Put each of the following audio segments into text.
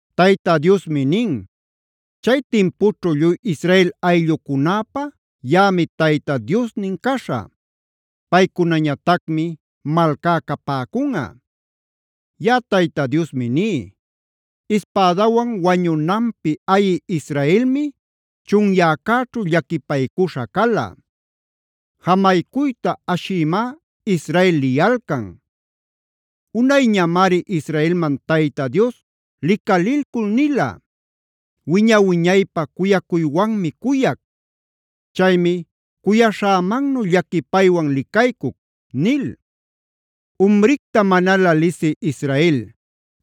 Tayta Diosmi nin: “Chay timpućhu lluy Israel ayllucunäpä yaꞌami Tayta Diosnin caśhä; paycunañatacmi malcá capäcunꞌa. Yaꞌa Tayta Diosmi ní: “Ispädawan wañunanpi ayi Israelmi chunyäcäćhu llaquipaycuśha cala. Jamaycuyta ashïmá Israel liyalcan. Unayñamari Israelman Tayta Dios licalilcul nila: ‘Wiña-wiñaypä cuyacuywanmi cuyac. Chaymi cuyaśhämannu llaquipaywan licaycuc’ nil. Umricta manalä lisï Israel,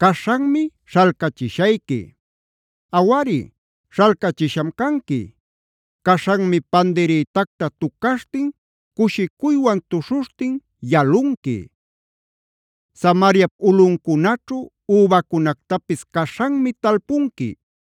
caśhanmi śhalcachishayqui. Awari, śhalcachisham canqui. Caśhanmi pandirïtacta tucaśhtin cushicuywan tuśhuśhtin yalunqui. Samariap ulꞌuncunaćhu übacunactapis caśhanmi talpunqui.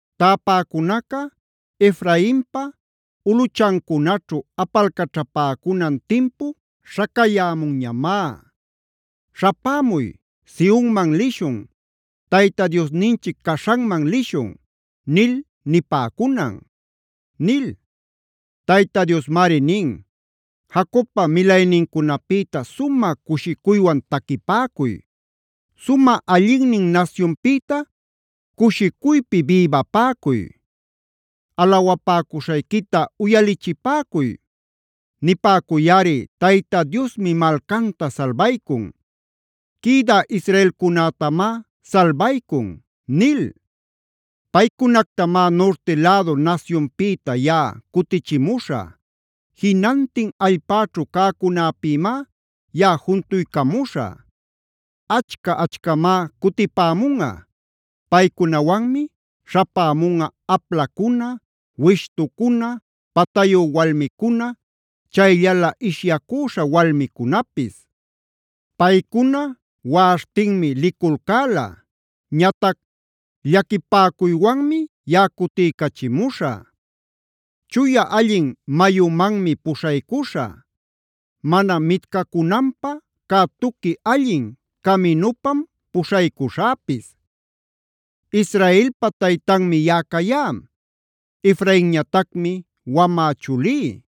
Täpäcunaca Efrainpa ulꞌuchancunaćhu apalcaćhapäcunan timpu śhacayämunñamá: ‘Śhapämuy; Sionman lishun. Tayta Diosninchic caśhanman lishun’ nil nipäcunan” nil. Tayta Diosmari nin: “Jacobpa milaynincunapïta sumä cushicuywan taquipäcuy. Sumä allinnin nasyunpïta cushicuypi bïbapäcuy. Alawapäcuśhayquita uyalichipäcuy. Nipäcuyꞌari: ‘Tayta Diosmi malcanta salbaycun. Quïdä israelcunätamá salbaycun’ nil. Paycunactamá nurti lädu nasyunpïta yaꞌa cutichimuśhä. Jinantin allpäćhu cäcunäpïmá yaꞌa juntuycamuśhä. Achca-achcamá cutipämunꞌa. Paycunawanmi śhapämunꞌa: aplacuna, wishtucuna, patayu walmicuna, chayllalä ishyacüśha walmicunapis. Paycuna waꞌaśhtinmi liculcäla. Ñatac llaquipäcuywanmi yaꞌa cutiycachimuśhä. Chuya allin mayumanmi puśhaycuśhä; mana mitcacunanpä cä tuqui allin caminupam puśhaycuśhäpis. Israelpa taytanmi yaꞌa cayá. Efrainñatacmi wamä chulí.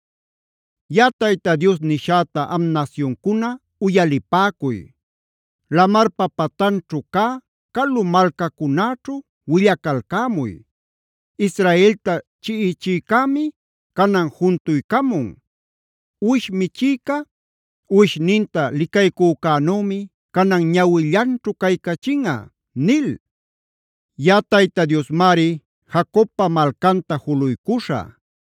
“Yaꞌa Tayta Dios nishäta am nasyuncuna, uyalipäcuy. Lamar patanćhu cä calu malcacunäćhu willacalcämuy: ‘Israelta chiꞌichïcämi canan juntuycamun. Uwish michïca uwishninta licaycücänümi canan ñawillanćhu caycachinꞌa’ nil. Yaꞌa Tayta Diosmari Jacobpa malcanta juluycuśhä;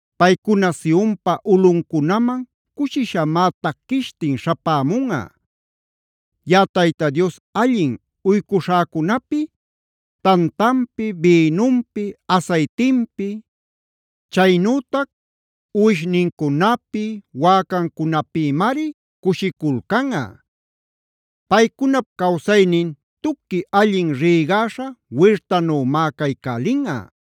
Paycuna Sionpa ulꞌuncunaman cushishamá taquishtin śhapämunꞌa. Yaꞌa Tayta Dios allin uycuśhäcunapi tantanpi, bïnunpi, asaytinpi, chaynütac uwishnincunapi, wäcancunapïmari cushiculcanꞌa. Paycunap cawsaynin tuqui allin rïgaśha wirtanümá caycälinꞌa.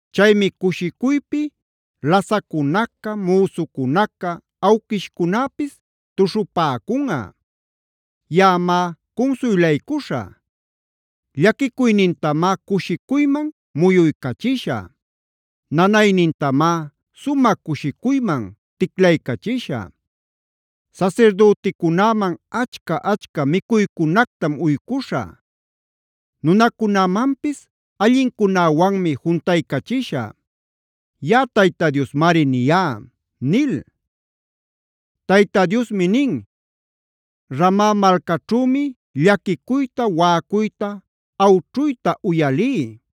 Chaymi cushicuypi lasaccunaca, müsucunaca, awquishcunäpis tuśhupäcunꞌa. Yaꞌamá cunsuylaycuśhä. Llaquicuynintamá cushicuyman muyuycachishä; nanaynintamá sumä cushicuyman ticlaycachishä. Sasirdüticunäman achca-achca micuycunactam uycuśhä; nunäcunamanpis allincunäwanmi juntaycachishä. Yaꞌa Tayta Diosmari niyá” nil. Tayta Diosmi nin: “Rama malcaćhümi llaquicuyta waꞌacuyta, awćhuyta uyalí.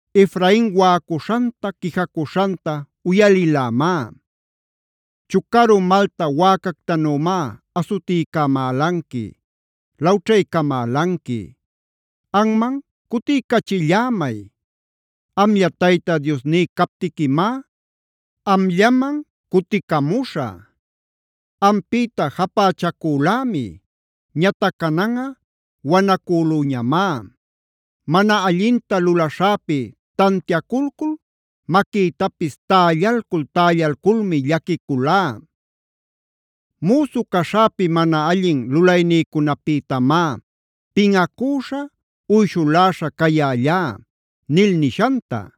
Efrain waꞌacuśhanta, quijacuśhanta uyalilämá: ‘Chucaru malta wäcactanümá asutiycamälanqui, lawćhaycamälanqui. Anman cutiycachillämay; amlla Tayta Diosní captiquimá amllaman cuticamuśhä. Ampïta japächacülämi; ñatac cananꞌa wanacülüñamá. Mana allinta lulaśhäpi tantiaculcul maquïtapis tällalcul-tällalculmi llaquiculá. Müsu caśhäpi mana allin lulaynïcunapïtamá pinꞌacüśha, uyshuläśha cayällá’ nil nishanta.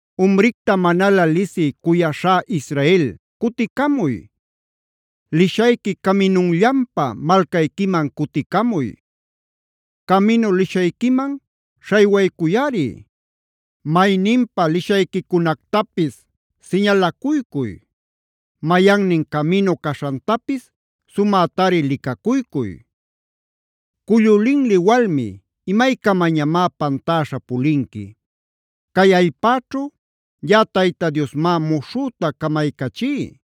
“Umricta manalä lisï cuyaśhá Israel, cuticamuy. Lishayqui caminunllanpa malcayquiman cuticamuy. Caminu lishayquiman śhaywaycuyꞌari. Mayninpa lishayquicunactapis siñalacuycuy. Mayannin caminu caśhantapis sumätari licacuycuy. Cullu linli walmi, ¿imaycamañamá pantäśha pulinqui? Cay allpäćhu yaꞌa Tayta Diosmá muśhüta camaycachí: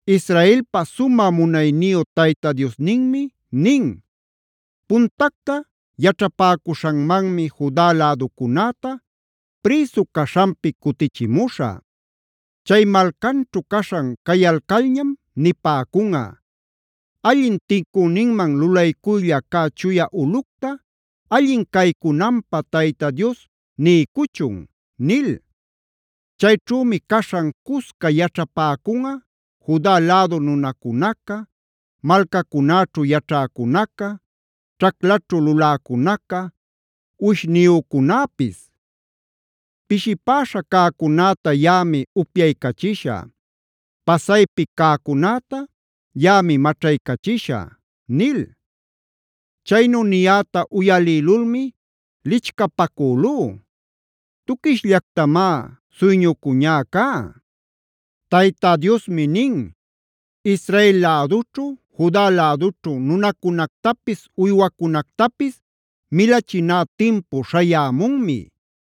Israelpa sumä munayniyu Tayta Diosninmi nin: “Puntacta yaćhapäcuśhanmanmi Juda läducunäta prïsu caśhanpi cutichimuśhä. Chay malcanćhu caśhan cayalcalñam nipäcunꞌa: ‘Allin tincüninman lulaycuylla cä chuya ulꞌucta, allin caycunanpä Tayta Dios niycuchun’ nil. Chayćhümi caśhan cusca yaćhapäcunꞌa Juda lädu nunacunaca, malcacunäćhu yaćhäcunaca, ćhaclaćhu luläcunaca, uwishniyücunäpis. Pishipäśha cäcunäta yaꞌami upyaycachishä. Pasaypi cäcunäta yaꞌami maćhaycachishä” nil. Chaynu niyäta uyalïlulmi lichcapacülú. Tuquishllactamá suyñucüñä cá. Tayta Diosmi nin: “Israel lädućhu, Juda lädućhu nunacunactapis, uywacunactapis milachiná timpu śhayämunmi.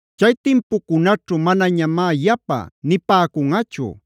“Chay timpucunaćhu manañamá yapa nipäcunꞌachu: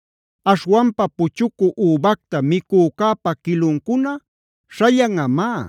“Aśhwanpa puchucü übacta micücäpa quiluncuna śhallanꞌamá.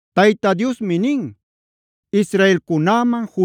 Tayta Diosmi nin: “Israelcunäman,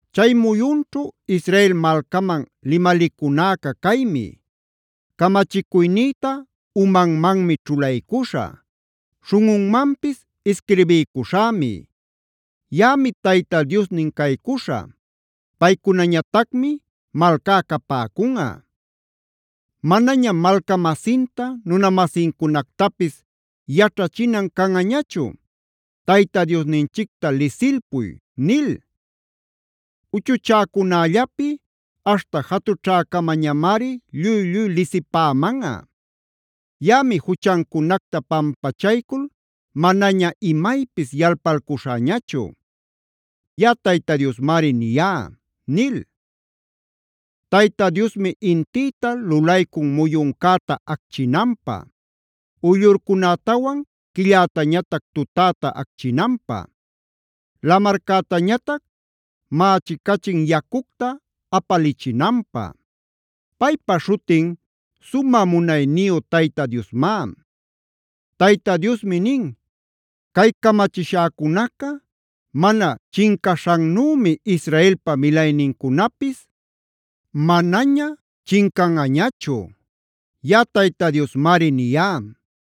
“Chay muyunćhu Israel malcaman limalicunäca caymi: Camachicuynïta umanmanmi ćhulaycuśhä; śhunꞌunmanpis isquirbiycuśhämi.j Yaꞌami Tayta Diosnin caycuśhä; paycunañatacmi malcá capäcunꞌa. Manañam malca-masinta, nuna-masincunactapis yaćhachinan canꞌañachu: ‘Tayta Diosninchicta lisilpuy’ nil. Uchuchäcunällapi aśhta jatućhäcamañamari lluy-lluy lisipämanꞌa. Yaꞌami juchancunacta pampachaycul manaña imaypis yalpalcuśhäñachu.k Yaꞌa Tayta Diosmari niyá” nil. Tayta Diosmi intïta lulaycun muyuncäta acchinanpä, uyllurcunätawan quillätañatac tutäta acchinanpä, lamarcätañatac mächicachin yacucta apalichinanpä. Paypa śhutin sumä munayniyu Tayta Diosmá. Tayta Diosmi nin: “Cay camachishäcunaca mana chincaśhannümi Israelpa milaynincunapis manaña chincanꞌañachu.l Yaꞌa Tayta Diosmari niyá.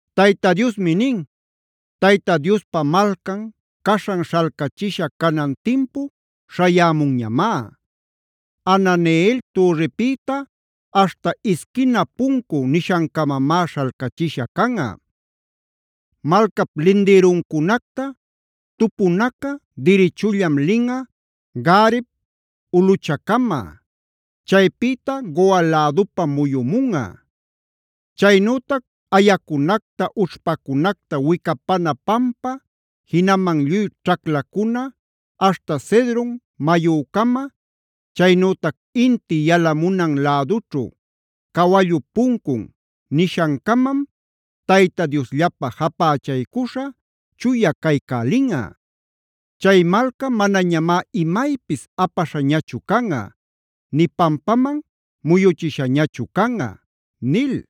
Tayta Diosmi nin: “Tayta Diospa malcan caśhan śhalcachisha canan timpu śhayämunñamá; Hananeel türripïta aśhta Isquina Puncu nishancamamá śhalcachiśha canꞌa. Malcap lindïruncunacta tupunaca dirichullam linꞌa Gareb ulꞌuchacama; chaypïta Goa lädupam muyumunꞌa. Chaynütac ayacunacta, ućhpacunacta wicapana pampa, jinaman lluy ćhaclacuna aśhta Cedron mayücama, chaynütac inti yalamunan lädućhu Cawallup Puncun nishancamam Tayta Diosllapä japächaycuśha chuya caycälinꞌa. Chay malca manañamá imaypis apaśhañachu canꞌa, nï pampaman muyuchishañachu canꞌa” nil.